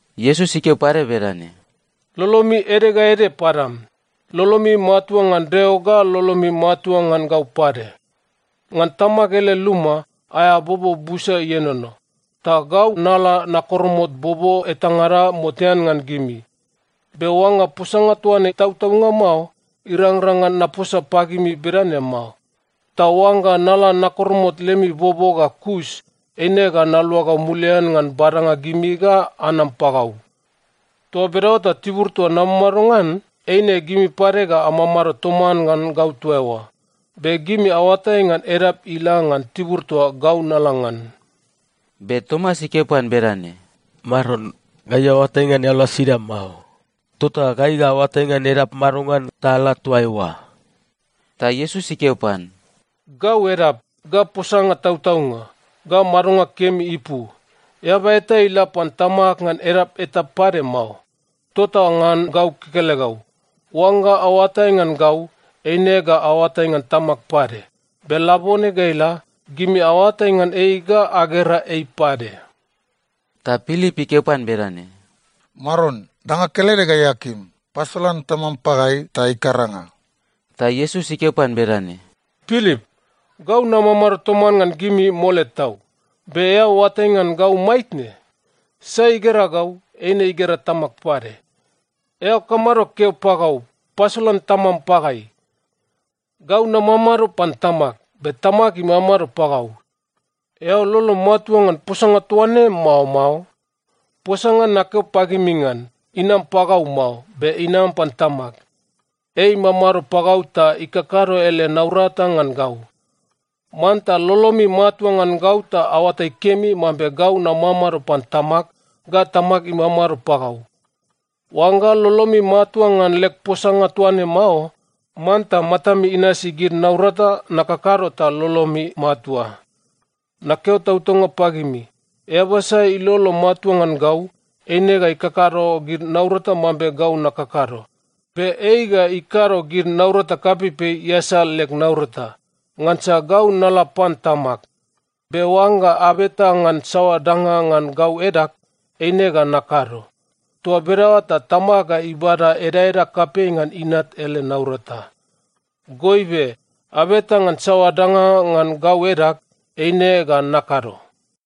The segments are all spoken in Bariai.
Iesus ikeo pade bedane, “Lolomi ede ga ede padam. Lolomi matua ngan Deo ga lolomi matua ngan gau pade. Ngan Tamag ele luma, aea bobo busa ienono. Ta gau nala nakoromot bobo etangada motean ngan gimi. Be oangga posanga toa ne tautaunga mao, irangrang ngan naposa pagimi bedane mao. Ta oangga nala nakoromot lemi bobo ga kus, eine ga naluagau mulian ngan badanga gimi ga anam pagau. Toa bedaoa ta tibur toa namamado ngan, eine gimi pade ga amamado toman ngan gau toa eoa. Be gimi aoatai ngan edap ila ngan tibur toa gau nala ngan.” Be Tomas ikeo pan bedane, “Maron, gai aoatai ngan eao la sida mao, tota gai ga aoatai ngan edap madongan ta ala toa eoa?” Ta Iesus ikeo pan, “Gau edap, ga posanga tautaunga, ga madonga kemi ipu. Eaba eta ila pan Tamag ngan edap eta pade mao. Tota ngan gau kekelegau. Oangga aoatai ngan gau, eine ga aoatai ngan Tamag pade. Be labone ga ila, gimi aoatai ngan ei ga agera ei pade.” Ta Pilip ikeo pan bedane, “Maron, danga kelede gai akim, pasolan Tamam pagai ta ikaranga.” Ta Iesus ikeo pan bedane, “Pilip, gau namamado toman ngan gimi mole tau, be eao oatai ngan gau maitne? Sai igera gau, eine igera Tamag pade. Eao kamado keo pagau, ‘Pasolan Tamam pagai’? Gau namamado pan Tamag, be Tamag imamado pagau. Eao lolom matua ngan posanga toa ne, mao mao? Posanga nakeo pagimi ngan, inam pagau mao, be inam pan Tamag. Ei imamado pagau ta ikakado ele naurata ngan gau. Manta lolomi matua ngan gau ta aoatai kemi mambe gau namamado pan Tamag ga Tamag imamado pagau. Oangga lolomi matua ngan leg posanga toa ne mao, manta matami inasi gid naurata nakakado ta lolomi matua. Nakeo tautaunga pagimi, eaba sai ilolo matua ngan gau, eine ga ikakado gid naurata mambe gau nakakado. Be ei ga ikado gid naurata kapeipei iasal leg naurata, ngansa gau nala pan Tamag. Be oangga abeta ngan saoa danga ngan gau edag, eine ga nakado. Toa bedaoa ta Tamag ga ibada edaeda kapei ngan Inat ele naurata. Goibe, abeta ngan saoa danga ngan gau edag, eine ga nakado.”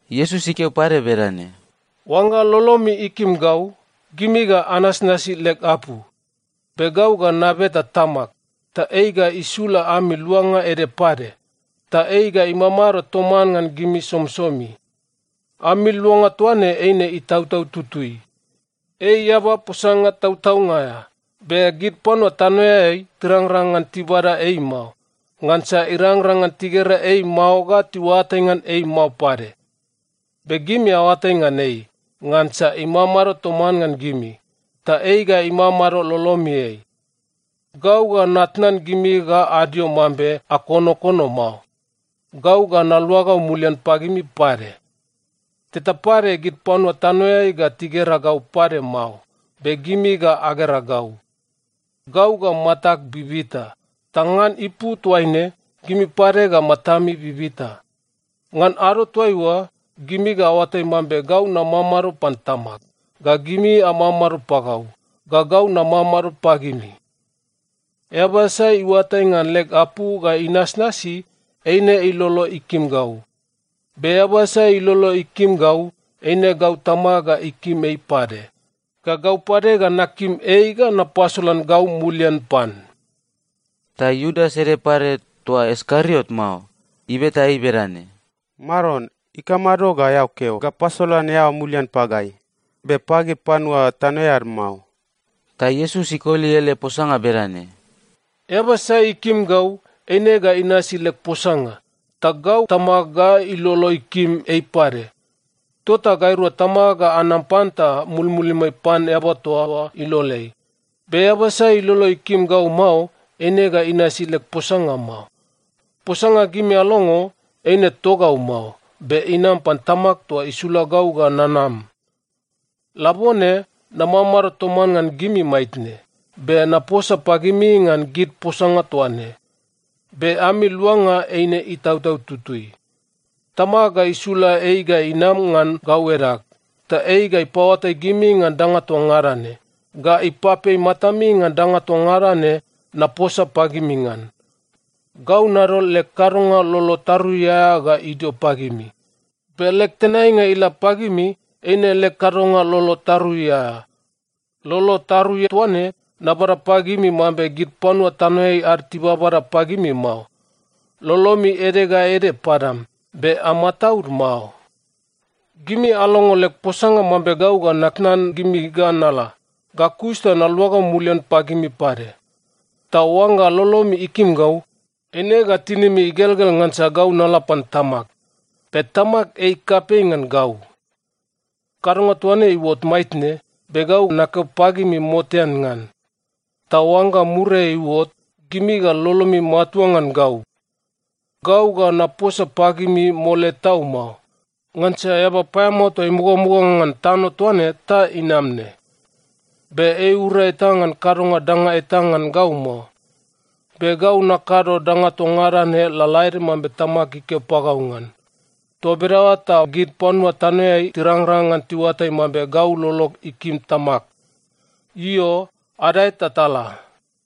Iesus ikeo pade bedane, “Oangga lolomi ikim gau, gimi ga anasnasi leg apu. Be gau ga nabeta Tamag, ta ei ga isula ami Luanga ede pade. Ta ei ga imamado toman ngan gimi somisomi. Ami Luanga toa ne eine Itautau Tutui. Ei Eaba posanga tautaunga aea, be gid panua tanoeai tirangrang ngan tibada ei mao. Ngansa irangrang ngan tigera ei mao ga tiuatai ngan ei mao pade. Be gimi aoatai ngan ei, ngansa imamado toman ngan gimi, ta ei ga imamado lolomiai. Gau ga natnan gimi ga adio mambe akonokono mao. Gau ga naluagau mulian pagimi pade. Teta pade gid panua tanoeai ga tigera gau pade mao, be gimi ga agera gau. Gau ga matag bibita, ta ngan ipu toaine, gimi pade ga matami bibita. Ngan ado toaiua, gimi ga aoatai mambe gau namamado pan Tamag, ga gimi amamado pagau, ga gau namamado pagimi. Eaba sai iuatai ngan leg apu ga inasnasi, eine ilolo ikim gau. Be eaba sai ilolo ikim gau, eine gau Tamag ga ikim ei pade, ga gau pade ga nakim ei ga napasolan gau mulian pan.” Ta Iudas ede pade, toa Iskariot mao, ibeta ei bedane, “Maron, ikamado ga eao keo ga pasolan eao mulian pagai, be pagid panua tanoeai ad mao?” Ta Iesus ikoli ele posanga bedane, “Eaba sai ikim gau, eine ga inasi leg posanga. Ta gau Tamag ga ilolo ikim ei pade. Tota gairua Tamag ga anam pan ta mulmulimai pan eaba toa oa iloleai. Be eaba sai ilolo ikim gau mao, eine ga inasi leg posanga mao. Posanga gimi alongo, eine togau mao. Be inam pan Tamag toa isula gau ga nanam. “Labone namamado toman ngan gimi maitne, be naposa pagimi ngan gid posanga toa ne. Be ami Luanga eine Itautau Tutui. Tamag ga isula ei ga inam ngan gau edag, ta ei ga ipaoatai gimi ngan danga toa ngada ne, ga ipapei matami ngan danga toa ngada ne naposa pagimi ngan. Gau nadol leg kadonga lolo tarui aea ga idio pagimi, be leg tenainga ila pagimi eine leg kadonga lolo tarui aea. Lolo tarui toa ne nabada pagimi mambe gid panua tanoeai ad tibabada pagimi mao. Lolomi ede ga ede padam, be amataud mao. “Gimi alongo leg posanga mambe gau ga natnan gimi ga nala, ga kus ta naluagau mulian pagimi pade. Ta oangga lolomi ikim gau, eine ga tinimi igelgel ngansa gau nala pan Tamag. Be Tamag ei kapei ngan gau. Kadonga toa ne iuot maitne, be gau nakeo pagimi motean ngan. Ta oangga muriai iuot, gimi ga lolomi matua ngan gau. Gau ga naposa pagimi mole tau mao, ngansa eaba paeamao toa imugamuga ngan tano toa ne ta inam ne. Be ei iura eta ngan kadonga danga eta ngan gau mao. Be gau nakado danga toa ngada ne lalaede mambe Tamag ikeo pagau ngan. Toa bedaoa ta gid panua tanoeai tirangrang ngan tiuatai mambe gau lolog ikim Tamag. “Io, adae ta tala.”